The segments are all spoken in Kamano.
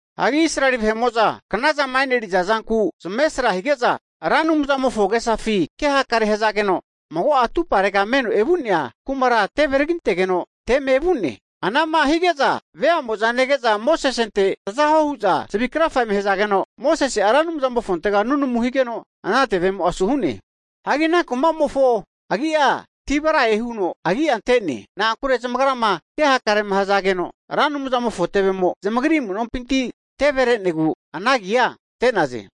Hagi Israeli vahe'mo'za knazama eneriza zanku zamesra hige'za Ra Anumzamofo agesafi kehakare hazageno, Ra Anumzamofona tusi asi vazigeno mago'a atuparega meno evu'nea kumara teve tagintegeno teme vu'ne. Ana'ma hige'za vea'moza nege'za, Mosesente taza huo hu'za zavi krafa eme hazageno, Mosese'a Ra Anumzamofontega nunamu higeno, ana tevemo'a asu hu'ne. Hagi ana kuma'mofo agi'a Taberae hu'za agia ante'naze. Na'ankure zamagrama ke hakarema hazageno Ra Anumzamofo tevemo zamagri amu'nompi teve re'negu anage agia ante'naze.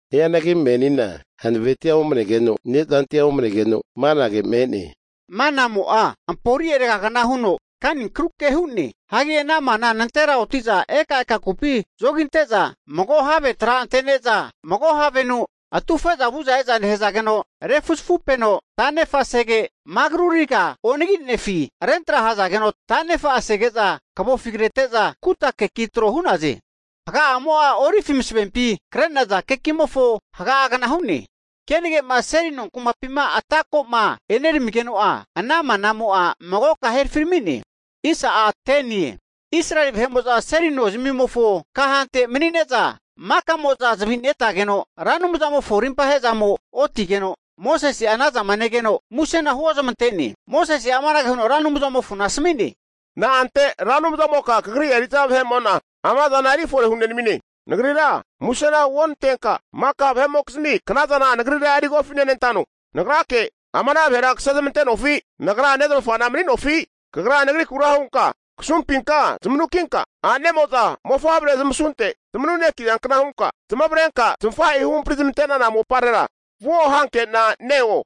Hianagi menina hanavetia omanegeno, ne'zantia omnegeno, manage me'ne! Manamo'a, ampori'e ragagna huno kani kruke hu'ne. Hagi ana mana nantera oti'za eka eka kupi zogi ante'za, mago have tra ante'neza mago havenu atufe'za vu'za eza nehazageno refuzafupeno ta'nefa sege, magru riga onaginefi rentra hazageno tanefa asege'za kavofi krete'za, kuta keki tro hu'naze. Haga'amo'a olivi masavempi kre'naza kekimofo haga gna hu'ne. Kenage'ma seli nonkumapima atako'ma eneramigeno'a ana manamo'a magoka herafirami'ne. Israeli vahe'mo'za seli nozamimofo kahante mani'ne'za maka'mo'za zavi netageno, Ra Anumzamofo rimpa ahe'zamo otigeno, Mosese'a ana zama negeno musena huozmante'ne. Anante Mosese'a amanage huno Ra Anumzamofona asmi'ne, Na'ante Ra Anumzamoka kagri eri'za vahekamo'na ama zana erifore hune nami'ne? Nagrira musena huonantenka, maka vahe'mokizmi knazana nagrira eri kofi nenantano? Nagrake ama ana vahera kase zamante'nofi? Nagra nezmafana mani'nofi? Kagra nagrikura hunka, kasumpinka zamanukinka, a'nemo'za mofavre zamasunte zamanu'nekiza kna hunka, zamavarenka zamafahe'i huhampri zamante'nana moparera vuo hankena neo?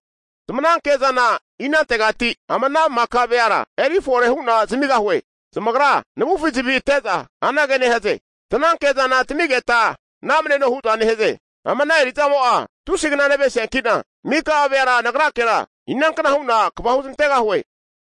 Zamananke zana inantegati ama ana maka veara eri fore hu'na zamigahue? Zamagra navufi zavi ate'za anage nehaze, tananke zana tamigeta namneno hu'za nehaze! Ama ana eri'zamo'a tusi'a kna navenesiankina, mika'a veara nagrakera, inankna hu'na kva huzmantegahue?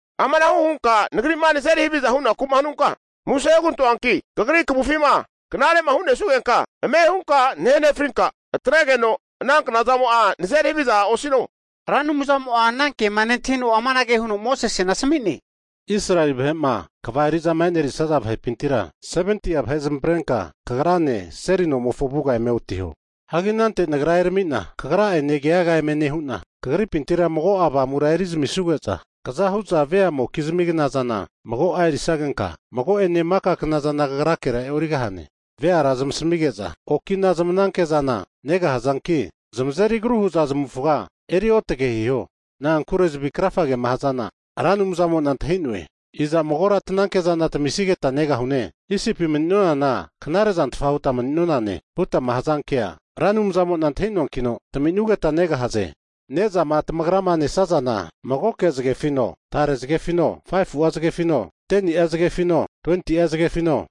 Amanahu hunka nagri'ma nazeri haviza hunaku'ma hanunka, muse hugantoanki Kagri kvufima knare'ma hu'nesugenka, ame' hunka nahe nefrinka, atregeno ama knazamo'a nazeri haviza osino. Hagi Ra Anumzamo'a ana kema nentahino amanage huno Mosesena asmi'ne, Israeli vahe'ma kva eri'zama enerisaza vahepintira 70'a vahe zamavarenka kagrane seli nomofo avuga eme otiho. Hagi anante Nagra eramina kagra'ene keaga eme nehu'na, kagripintira mago'a Avamura eri zami suge'za, kaza hu'za veamokizmi knazana mago'a erisagenka, mago'ene maka knazana kagrakera e'origahane. Veara zamasamige'za, okina zamananke'zana (mit) negahazanki, zamazeri agru hu'za zamavufaga eri otage hiho. Na'ankure zavi krafagema hazana Ra Anumzamo'na antahi'noe. Iza magora tananke zana tamisigeta negahune! Isipi mani'nonana knare'zantfa huta mani'nonane hutama hazankea, Ra Anumzamo'na antahinoankina tmananke'zana taminugeta negahaze. Ne'zama tamagrama nesazana, magoke zagefino, tare zagefino, 5fu'a zagefino 10ni'a zagefino, 20'a zagefino,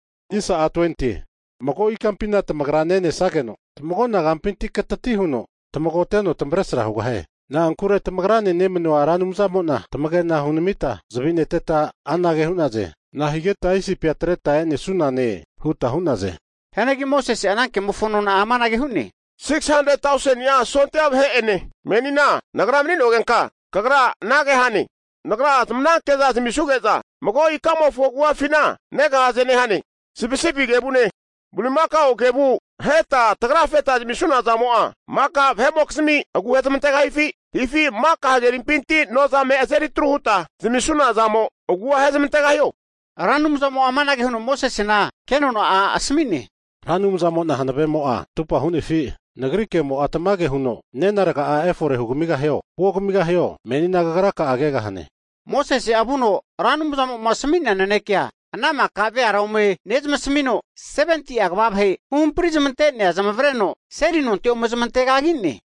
mago ikampina tamagra nenesageno, tamagona kampinti katati huno tamagoteno tamavresra hugahie. Na'ankure tamagrane nemanua Ra Anumzamo'na tamage'na hunamita zavi neteta anage hu'naze, Nahigeta Isipi'a atreta e'nesunane? huta hu'naze. Hianagi Mosese'a ana kemofo nona'a amanage hu'ne, 600,000ni'a sondia vahe'ene menina nagra mani'nogenka, Kagra anage hane, Nagra zamananke'za zamisanuge'za mago ikamofo agu'afina negahaze nehane. Sipisipi kevune, bulimakao kevu aheta tragafeta zamisuna zamo'a, maka vahe'mokizmi agu hezmantegahifi? Hifi maka hagerimpinti nozame azeri atru huta zamisunazamo, agua ahezmantegahio? Ra Anumzamo'a amanage huno Mosesena ke nona'a asmi'ne, Ra Anumzamo'na hanavemo'a atupa hu'nefi? Nagri kemo'a tamage huno nena raga'a efore hugamigahio, huogamigahio menina kagra kegahane. Mosese'a vuno Ra Anumzamo'ma asmi'nea naneke'a ana maka veara ome nezamasamino, 70'a kva vahe huhampri zamante'nea zamavareno seli nonte ome zamante kagi'ne.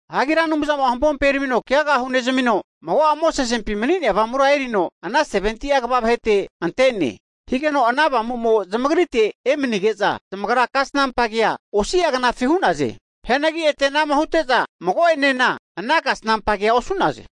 Hagi Ra Anumzamo'a hampompi eramino keaga hunezamino, mago'a Mosesempi mani'nea Avamura erino ana 70'a kva vahete ante'ne. Higeno ana Avamuma zamagrite emanige'za zamagra kasnampa kea osi'a knafi hu'naze. Hianagi ete anama hute'za mago'enena ana kasnampa kea osu'naze.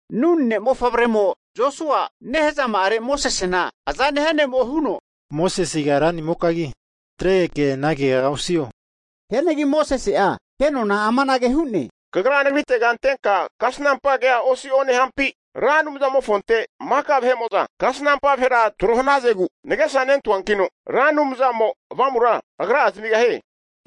Nun ne'mofavremo Josua, nehazama'are Mosesena aza nehia ne'mo huno, Mosesega ranimokagi zanatregeke ana keaga osi'o. Hianagi Mosese'a ke nona amanage hu'ne, kagra nagritega antenka kasnampa kea osi'o nehampi? Ra Anumzamofonte maka kasnampa vahera tro hanazegu nagesa nentahuankino, Ra Anumzamo'a Avamura Agra'a zamigahie!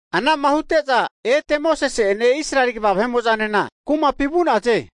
Ana'ma hute'za ete Mosese'ene Israeli kva vahe'mo'zanena kumapi vu'naze.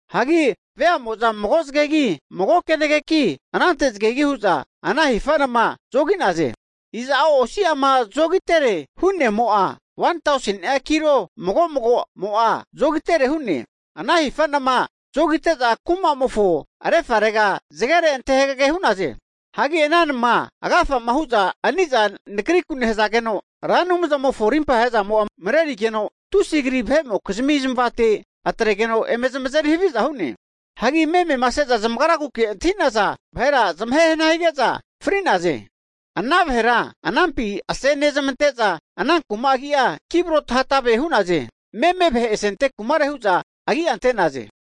Hagi veamo'za mago zagegi, mago kenageki, anante zagegi hu'za ana hifa nama zogi'naze. (Iza'o osi'ama zogitere hu'nemo'a 1tauseni'a kilo mago mago'mo'a zogitere hu'ne) ana hifa' nama zogite'za kumamofo refarega zagere ante hagege hu'naze. Hagi ana namama agafama hu'za ani'za nakriku nehazegeno, Ra Anumzamofo rimpa he'zamo'a mrerigeno, tusi kri vahe'mokizmi zamavate atregeno eme zamazeri haviza hu'ne. Hagi memema ase'za zamagraguke'ma antahi'naza vahera zamahe hana hige'za fri'naze. Ana vahera anampi asene zamante'za ana kuma agi'a Kibrot-hatava hu'naze, (meme vahe asente kumare hu'za agi'a ante'naze).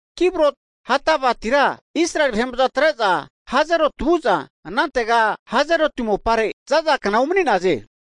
Kibrot-hatavatira Israeli vahe'mo'za atre'za Hazeroti vu'za, anantega Hazeroti mopare zaza kna umani'naze.